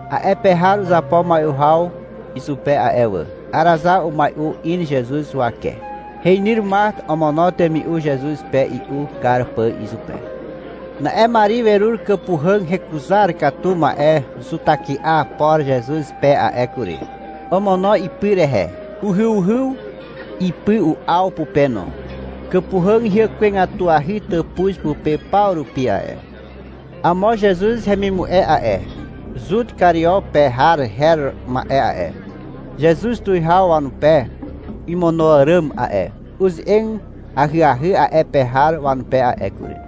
A'e pe har uzapo mai'u haw izupe a'e wà. Arazar umai'u in Zezuz huwake. Heinyr Mart omono temi'u Zezuz pe i'u kar pà izupe. Na'e Mari werur kàpuhàg hekuzar katu ma'e zutahyky'a por Zezuz pe a'e kury. Omono ipy rehe. Uhyuhyw ipy u'aw pupe no. Kàpuhàg hyàkwegatuahy tàpuz pupe paw rupi a'e. Amo Zezuz hemimu'e a'e, Zut Kario pe har her ma'e a'e, (Zezuz tuwihaw wanupe imono àràm a'e) uze'eg ahyahy a'e pe har wanupe a'e kury.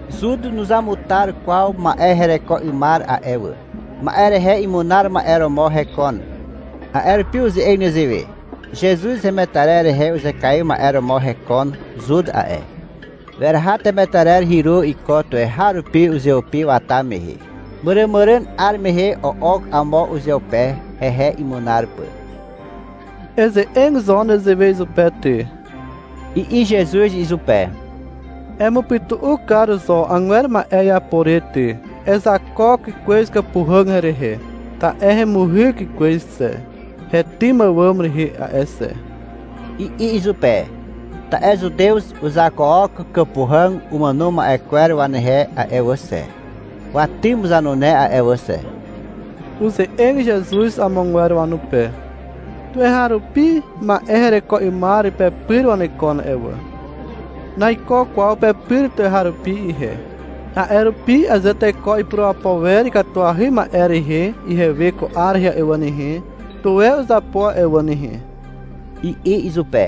Zut nuzamutar kwaw ma'e hereko 'ymar a'e wà. Ma'e rehe imunar ma'e romo hekon. A'e rupi uze'eg nezewe. Zezuz hemetarer rehe uzekaiw ma'e romo hekon Zut a'e. Weraha temetarer hyru iko tuweharupi uzeupi wata mehe. Màràmàràn 'ar mehe o'ok amo uzeupe, hehe imunar pà. — Eze'eg zo nezewe izupe ty, i'i Zezuz izupe. — Emupytu'u kar zo agwer ma'e iapo re ty. Uzakook kwez kàpuhàg herehe, ta'e hemuhyk kwez xe, hetym àwàm rehe a'e xe, i'i izupe. (Ta'e Zutew uzakook kàpuhàg umàno ma'e kwer wanehe a'e wà xe, watym zanune a'e wà xe.) Uze'eg Zezuz amogwer wanupe. — Tuweharupi ma'e hereko 'ymar pepyr wanekon a'e wà. Naiko kwaw pepyr tuweharupi ihe nehe. A'e rupi aze teko ipurapo wer ikatuahy ma'e rehe ihewe ko 'ar rehe a'e wà nehe, tuwe uzapo a'e wà nehe, i'i izupe.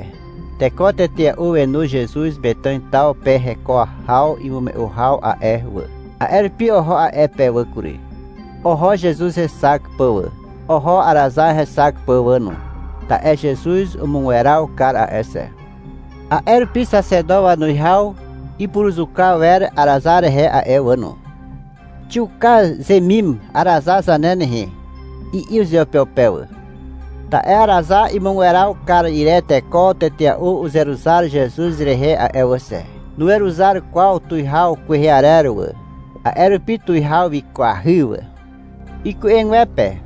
Teko tetea'u wenu Zezuz Metàn taw pe heko haw imume'u haw a'e wà. A'e rupi oho a'e pe wà kury. Oho Zezuz hexak pà wà. Oho Arazar hexak pà wà no, ta'e Zezuz umugweraw kar a'e xe. A'e rupi xaxeto wanuwihaw ipuruzuka wer Arazar rehe a'e wà no. Xiuka zemim Arazar zane nehe, i'i uzeupeupe wà. Ta'e Arazar imugweraw kar ire teko tetea'u uzeruzar Zezuz rehe a'e wà xe. Nuweruzar kwaw uwihaw kwehe arer wà. A'e rupi tuwihaw wikwahy wà. Iku'egwepe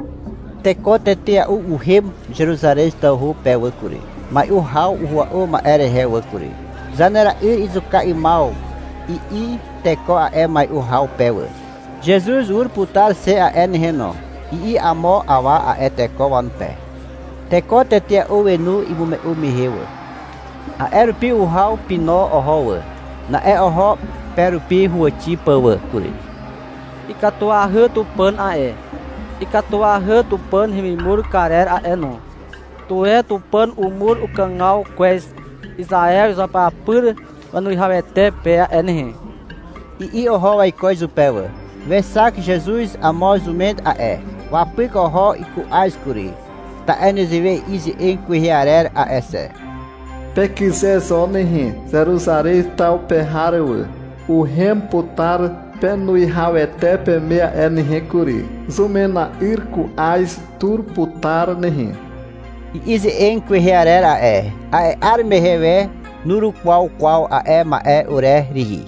teko tetea'u uhem Zeruzarez tawhu pe wà kury, mai'u haw uhua'u ma'e rehe wà kury. (— Zanera'yr izuka 'ymaw, i'i teko a'e mai'u haw pe wà.) — Zezuz ur putar xe a'e nehe no, i'i amo awa a'e teko wanupe. Teko tetea'u wenu imume'u mehe wà. A'e rupi uhaw pino oho wà. Na'e oho pe rupi huwàxi pà wà kury. — Ikatuahy Tupàn a'e. Ikatuahy Tupàn hemimur karer a'e no. Tuwe Tupàn umur ukàgaw kwez Izaew izuapyapyr wanuwihawete pe a'e nehe, i'i oho waiko izupe wà. Wexak Zezuz amo zumen a'e. Wapyk oho iku'az kury, ta'e nezewe i'i ze'eg kwehe arer a'e xe. Pekyze zo nehe, Zeruzarez taw pe har wà. Uhem putar penuwihawete peme a'e nehe kury. Zumena'yr ku'az tur putar nehe, i'i ze'eg kwehe arer a'e. A'e 'ar mehe we nurukwaw kwaw a'e ma'e ure rihi.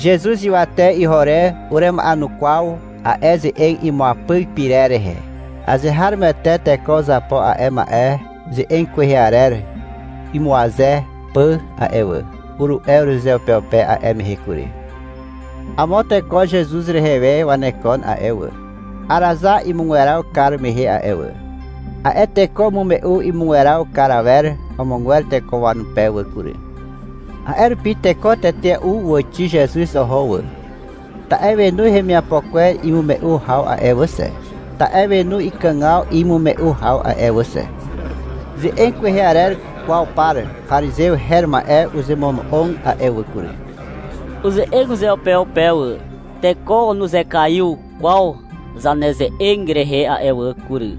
Zezuz ywate iho re urema'enukwaw a'e ze'eg imuapyk pyrer rehe. — Azeharomoete teko uzapo a'e ma'e ze'eg kwehe arer imuaze pà a'e wà, uru'e urezeupeupe a'e mehe kury. Amo teko Zezuz rehe we wanekon a'e wà, Arazar imugweraw kar mehe a'e wà. A'e teko umume'u imugweraw kar awer amogwer teko wanupe wà kury. A'e rupi teko tetea'u uwàxi Zezuz oho wà, ta'e wenu hemiapo kwer imume'u haw a'e wà xe, ta'e wenu ikàgaw imume'u haw a'e wà xe. Ze'eg kwehe arer kwaw par parizew her ma'e uzemono'og a'e wà kury. Uze'eg uzeupeupe wà. — Teko nuzekaiw kwaw zaneze'eg rehe a'e wà kury.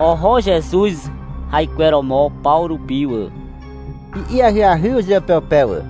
Oho Zezuz haikweromo paw rupi wà, i'i ahyahy uzeupeupe wà.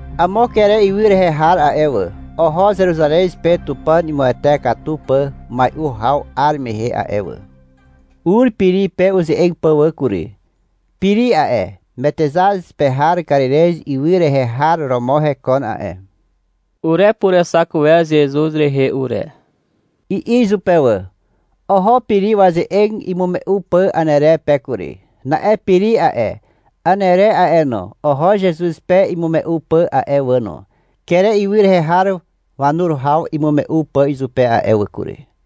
Amo Kere ywy rehe har a'e wà, oho Zeruzarez pe Tupàn imuwete katu pà mai'u haw 'ar mehe a'e wà. Ur Piri pe uze'eg pà wà kury. (Piri a'e, Metexaz pe har Karirez ywy rehe har romo hekon a'e.) — Urepurexak wer Zezuz rehe ure, i'i izupe wà. Oho Piri waze'eg imume'u pà Anere pe kury. Na'e Piri a'e, Anere a'e no, oho Zezuz pe imume'u pà a'e wà no, Kere ywy rehe har wanur haw imume'u pà izupe a'e wà kury.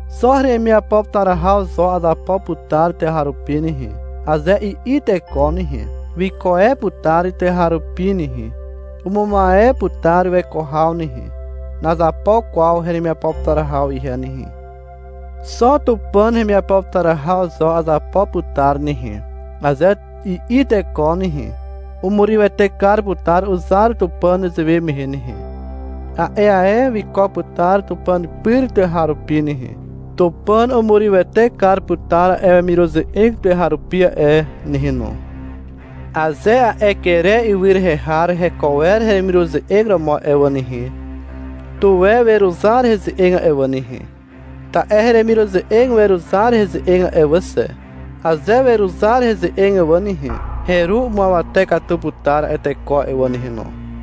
— Xo heremiapo putar haw zo azapo putar tuweharupi nehe, aze i'i teko nehe, wiko e putar tuweharupi nehe. Umumaw e putar weko haw nehe. Nazapo kwaw heremiapo putar haw ihe nehe. Xo Tupàn hemiapo putar haw zo azapo putar nehe, aze i'i teko nehe, umurywete kar putar uzar Tupàn nezewe mehe nehe. A'e ae wiko putar Tupàn pyr tuweharupi nehe. Tupàn umurywete kar putar a'e wemiruze'eg tuweharupi a'e nehe no. Aze a'e Kere ywy rehe har heko wer heremiruze'eg romo a'e wà nehe, tuwe weruzar heze'eg a'e wà nehe. Ta'e heremiruze'eg weruzar heze'eg a'e wà xe. Aze weruzar heze'eg wà nehe, heru umuawate katu putar a'e teko a'e wà nehe no.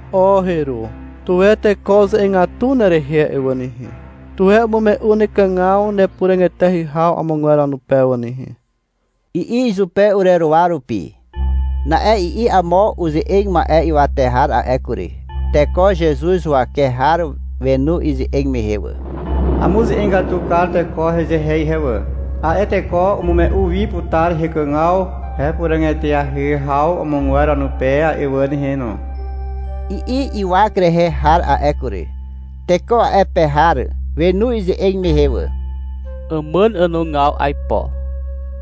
— O heru, tuwe teko uze'egatu nerehe a'e wà nehe, tuwe umume'u nekàgaw nepuràg eteahy haw amogwer wanupe wà nehe, i'i izupe ureruwa rupi. Na'e i'i amo uze'eg ma'e ywate har a'e kury. Teko Zezuz huwake har wenu ize'eg mehe wà. — Amuze'egatu kar teko hezehe ihe wà. A'e teko umume'u wi putar hekàgaw hepuràg eteahy haw amogwer wanupe a'e wà nehe no, i'i ywak rehe har a'e kury. Teko a'e pe har wenu ize'eg mehe wà. — Àmàn ànogaw aipo,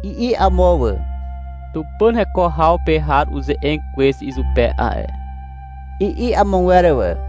i'i amo wà. — Tupàn heko haw pe har uze'eg kwez izupe a'e, i'i amogwer wà.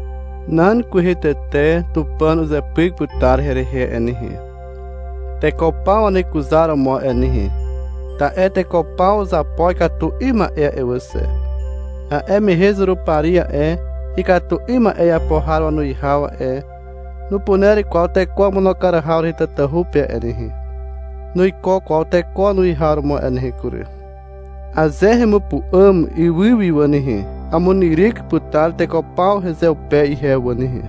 Nan kwehe tete Tupàn uzepyk putar herehe a'e nehe, teko paw wanekuzaromo a'e nehe, ta'e teko paw uzapo ikatu 'ym ma'e a'e wà xe. A'e mehe Zurupari a'e, ikatu 'ym ma'e iapo har wanuwihaw a'e, nupuner kwaw teko wamono kar haw rehe tatahu pe a'e nehe. Nuiko kwaw teko wanuwihaw romo a'e nehe kury. Aze hemupu'àm ywy wi wà nehe, amunyryk putar teko paw hezeupe ihe wà nehe.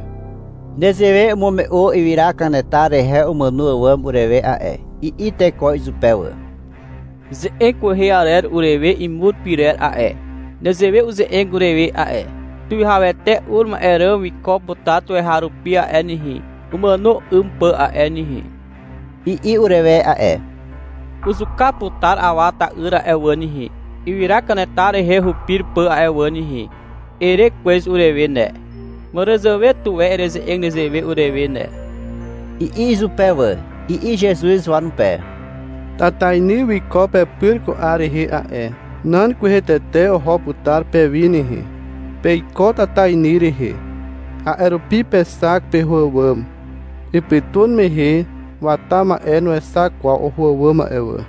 (Nezewe umume'u ywyra kanetar rehe umàno àwàm urewe a'e.) I'i teko izupe wà. — Ze'eg kwehe arer urewe imur pyrer a'e, nezewe uze'eg urewe a'e. — Tuwihawete ur ma'e ràm wiko putar tuweharupi a'e nehe, umàno 'ym pà a'e nehe, i'i urewe a'e. — Uzuka putar Awa ta'yr a'e wà nehe, ywyra kanetar rehe hupir pà a'e wà nehe, ere kwez urewe ne. Màràzàwe tuwe ereze'eg nezewe urewe ne, i'i izupe wà. I'i Zezuz wanupe. — Tatainy wiko pepyr ko 'ar rehe a'e. Nan kwehe tete oho putar pewi nehe. Peiko tatainy rehe. A'e rupi pexak peho àwàm. Ipytun mehe wata ma'e nuexak kwaw oho àwàm a'e wà.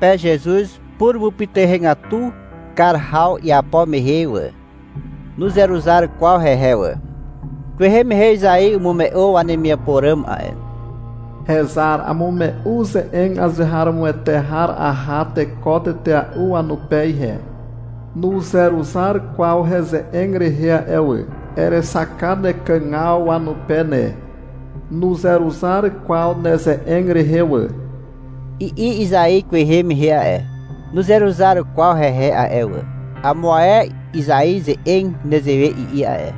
Wexak zepe Zezuz purumupytuhegatu kar haw iapo mehe wà. Nuzeruzar kwaw hehe wà. Kwehe mehe Izai umume'u wanemiapo ràm a'e. Hezar, amume'u ze'eg azeharomoete har aha teko tetea'u wanupe ihe. Nuzeruzar kwaw heze'eg rehe a'e wà. Erexak kar nekàgaw wanupe ne. Nuzeruzar kwaw neze'eg rehe wà, i'i Izai kwehe mehe a'e. Nuzeruzar kwaw hehe a'e wà. Amo ae Izai ze'eg nezewe i'i a'e.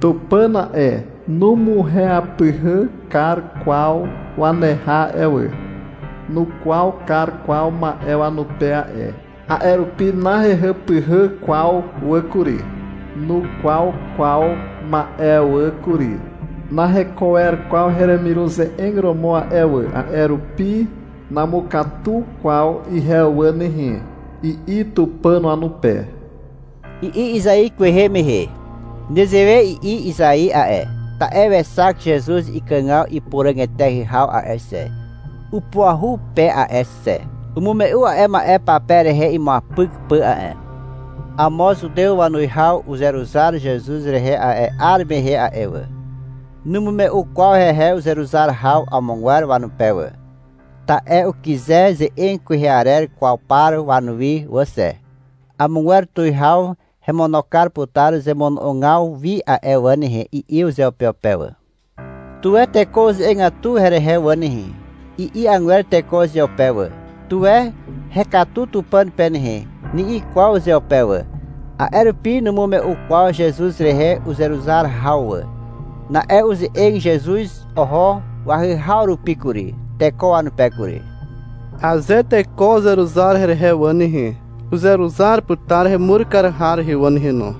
Tupàn a'e, numuehàpyhà kar kwaw waneha a'e wà. Nukwaw kar kwaw ma'e wanupe a'e. A'e rupi nahehàpyhà kwaw wà kury. Nukwaw kwaw ma'e wà kury. Naheko wer kwaw heremiruze'eg romo a'e wà. A'e rupi namukatu kwaw ihe wà nehe, i'i Tupàn wanupe, i'i Izai kwehe mehe. Nezewe i'i Izai a'e, ta'e wexak Zezuz ikàgaw ipuràg eteahy haw a'e xe, (upuahu pe a'e xe). Umume'u a'e ma'e pape rehe imuapyk pà a'e. Amo Zutew wanuwihaw uzeruzar Zezuz rehe a'e 'ar mehe a'e wà. Numume'u kwaw hehe uzeruzar haw amogwer wanupe wà. Ta'e ukyze ze'eg kwehe arer kwaw par wanuwi wà xe. — Amogwer tuwihaw hemono kar putar zemono'ogaw wi a'e wà nehe, i'i uzeupeupe wà. — Tuwe teko uze'egatu herehe wà nehe, i'i agwer teko uzeupe wà. — Tuwe hekatu Tupàn pe nehe, ni'i kwaw uzeupe wà. A'e rupi numume'u kwaw Zezuz rehe uzeruzar haw wà. Na'e uze'eg Zezuz oho wahyhaw rupi kury, teko wanupe kury. — Aze teko uzeruzar herehe wà nehe, uzeruzar putar hemur kar har rehe wà nehe no.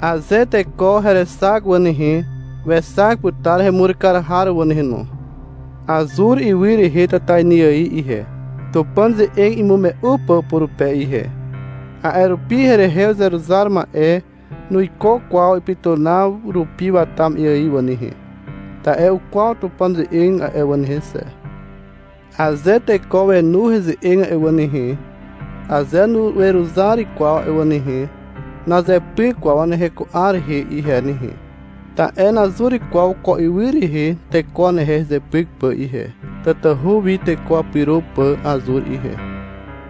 Aze teko herexak wà nehe, wexak putar hemur kar har wà nehe no. Azur ywy rehe tatainy ài ihe, Tupàn ze'eg imume'u pà purupe ihe. A'e rupi herehe uzeruzar ma'e nuiko kwaw ipytunaw rupi wata ma'e ài a'e wà nehe, ta'e ukwaw putar Tupàn ze'eg a'e wà nehe xe. Aze teko wenu heze'eg a'e wà nehe, aze nuweruzar kwaw a'e wà nehe, nazepyk kwaw wanehe ko 'ar rehe ihe nehe. Ta'e nazur kwaw ko ywy rehe teko wanehe hezepyk pà ihe. Tatahu wi teko wapyro pà azur ihe.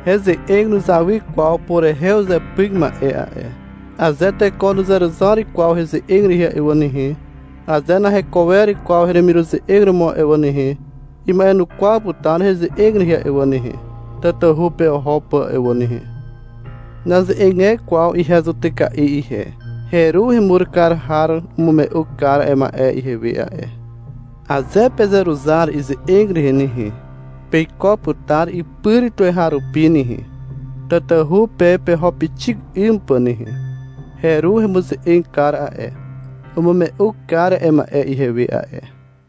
Heze'eg nuzawy kwaw purehe uzepyk ma'e a'e. Aze teko nuzeruzar kwaw heze'eg rehe a'e wà nehe, aze naheko wer kwaw heremiruze'eg romo a'e wà nehe, ima'enukwaw putar heze'eg rehe a'e wà nehe, tatahu pe oho pà a'e wà nehe. Naze'eg e kwaw ihe zutyka'i ihe. Heru hemur kar har umume'u kar a'e ma'e ihewe a'e. Aze pezeruzar ize'eg rehe nehe, peiko putar ipyr tuweharupi nehe, tatahu pe peho pixik 'ym pà nehe. Heru hemuze'eg kar a'e, umume'u kar a'e ma'e ihewe a'e.